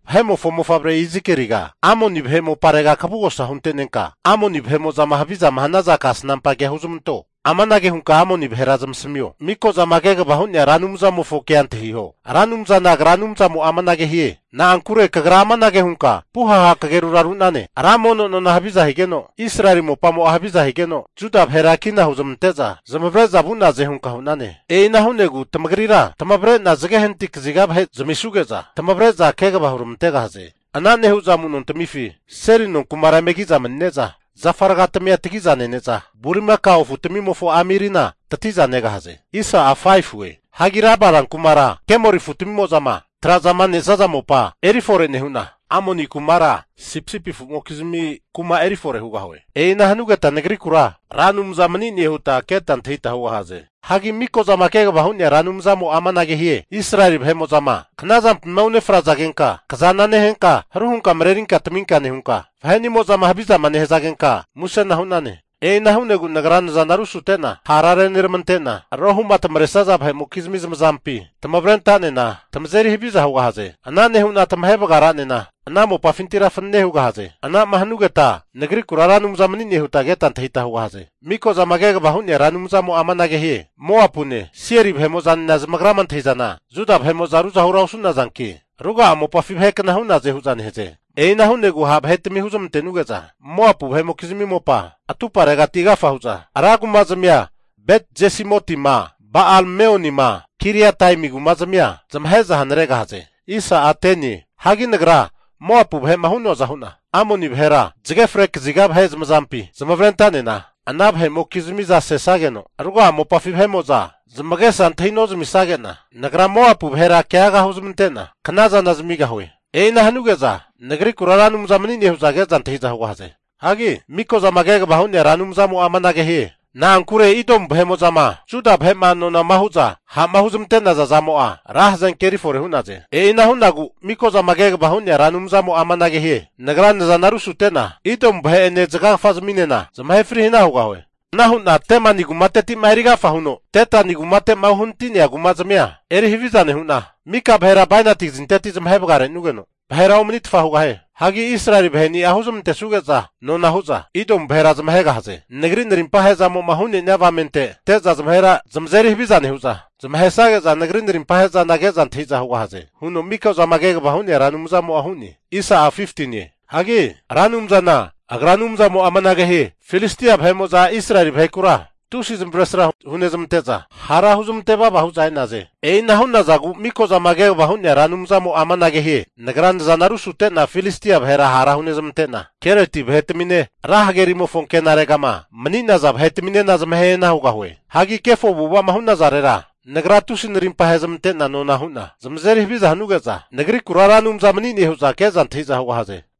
Vahe'mofo mofavre Izikeliga, Amoni vahe moparega kavugosa hunte'nenka, Amoni vahe'mo'zama havizama hanaza kasnampa kea huzmanto. Amanage hunka Amoni vahera zamasamio, Mikozama Kegavama Hu'nea Ra Anumzamofo kea antahiho, Ra Anumzana Agra Anumzamo'a amanage hie, Na'ankure kagra amanage hunka puhaha kagerura ru'nane, ra mono nona haviza higeno, Israeli mopamo'a haviza higeno, Juda vahera kina huzmante'za zamavare'za vu'naze hunka hu'nane. E'ina hu'negu tamagrira tamavre'na zage hanati kaziga vahe zamisuge'za, tamavre'za kegava huramantegahaze. Ana nehu'za amu'nontamifi seli nonkumara eme kiza manine'za, zafa aragatimia tagiza nene'za, bulimakao afutamimofo amirina tati'za negahaze. Hagi Raba rankumara kemori afutamimo'zama traza nesaza mopa eri fore nehu'na, Amoni kumara sipisipi afu'mokizmi kuma erifore hugahue. E'ina hanugeta Nagrikura Ra Anumza mani'ne huta keta antahita hugahaze. Hagi Mikozama Kegavama Hu'nea Ra Anumzamo'a amanage hie, Israeli vahe'mo'zama knazampima unefrazageta tamazana neheta, haruhuta marerita tamita nehuta, vahe'nimo'zama havizama nehazageta musena hu'naze. E'ina hu'nagu Nagra nazana rusute'na hara reneramante'na, rohu'ma tamaresaza vahe'mokizmi zamazampi tamavre anta'nena tamazeri haviza hugahaze. Ana nehu'na tamahe vagara'nena ana mopafintira fanane hugahaze. Anama hanugeta Nagrikura Ra Anumza mani'ne huta keta antahita hugahaze. Miko'zama kegavama hu'nea Ra Anumzamo'a amanage hie, Moapu ne, Seiri vahemo'zanena zamagrama antahi'zana Juda vahe'mo'za ruzahura osu'nazanki, ruga'a mopafi vahe kna hu'naze hu'za nehaze. E'ina hu'negu ha' vahe'tami huzmante'nuge'za Moapu vahe'mokizimi mopa atumparegati agafa hu'za rankumazmia Bet-Jesimotima, Ba'al-Meonima, Kiriataimi kuma'zmia zamahe'za hanaregahaze. Hagi Nagra Moapu vahe'ma hu'noaza hu'na Amoni vahera zage fre kaziga vahe'mokizmi zamazampi zamavare anta'nena, ana vahe'mokizmiza sesageno ruga'a mopafi vahe'mo'za zamagesa antahi nozmisage'na, Nagra Moapu vahera keaga huzmante'na knazana zamigahue. E'ina hanuge'za Nagrikura Ra Anumza mani'ne hu'za ke'za antahi'za hugahaze. Hagi Mikozama kegavama hu'nea Ra Anumzamo'a amanage hie, Na'ankure Idomu vahe'mo'zama Juda vahe'ma nona hu'za ha'ma huzmante'naza zamo'a, ra hazenke eri fore hu'naze. E'ina hu'nagu Mikozama Kegavama Hu'nea Ra Anumzamo'a amanage hie, Nagra nazana rusute'na Idomu vahe'ene zagagafazminena zamahe fri hana hugahue. Ana hu'na Temani kumateti'ma erigafa huno Detani kumate'ma uhanati'nea kumazmia eri haviza nehu'na, mika vahera bainati kazinteti zamahe vagarenugeno vahera omanitfa hugahie. Hagi Israeli vaheni'a huzmantesuge'za nona hu'za Idomu vahera zamahegahaze. Nagri narimpa ahe'zamo'ma hu'nenia avamente ante'za zamazeri haviza nehu'za, zamahesage'za Nagri narimpahe'zana ke'za antahi'za hugahaze huno Miko'zama Kegavama Hu'nea Ra Anumzamo'a hu'ne. Hagi Ra Anumzana Agra Anumzamo'a amanage hie, Filistia vahe'mo'za Israeli vahekura tusi zamavaresra hunezmante'za, hara huzmante vava hu'za neaze. E'ina hu'nazagu Mikozama Kegavama hu'nea Ra Anumzamo'a amanage hie, Nagra nazana rusute'na Filistia vahera hara hunezmante'na, Kereti vahetamine, ra hagerimofo anke'regama mani'naza vahetaminena zamahe hana hugahue. Hagi kefo avu'ava'ma hu'nazarera, Nagra tusi narimpa ahezmante'na nona hu'na zamazeri haviza hanuge'za Nagrikura Ra Anumza mani'ne hu'za ke'za antahi'za hugahaze.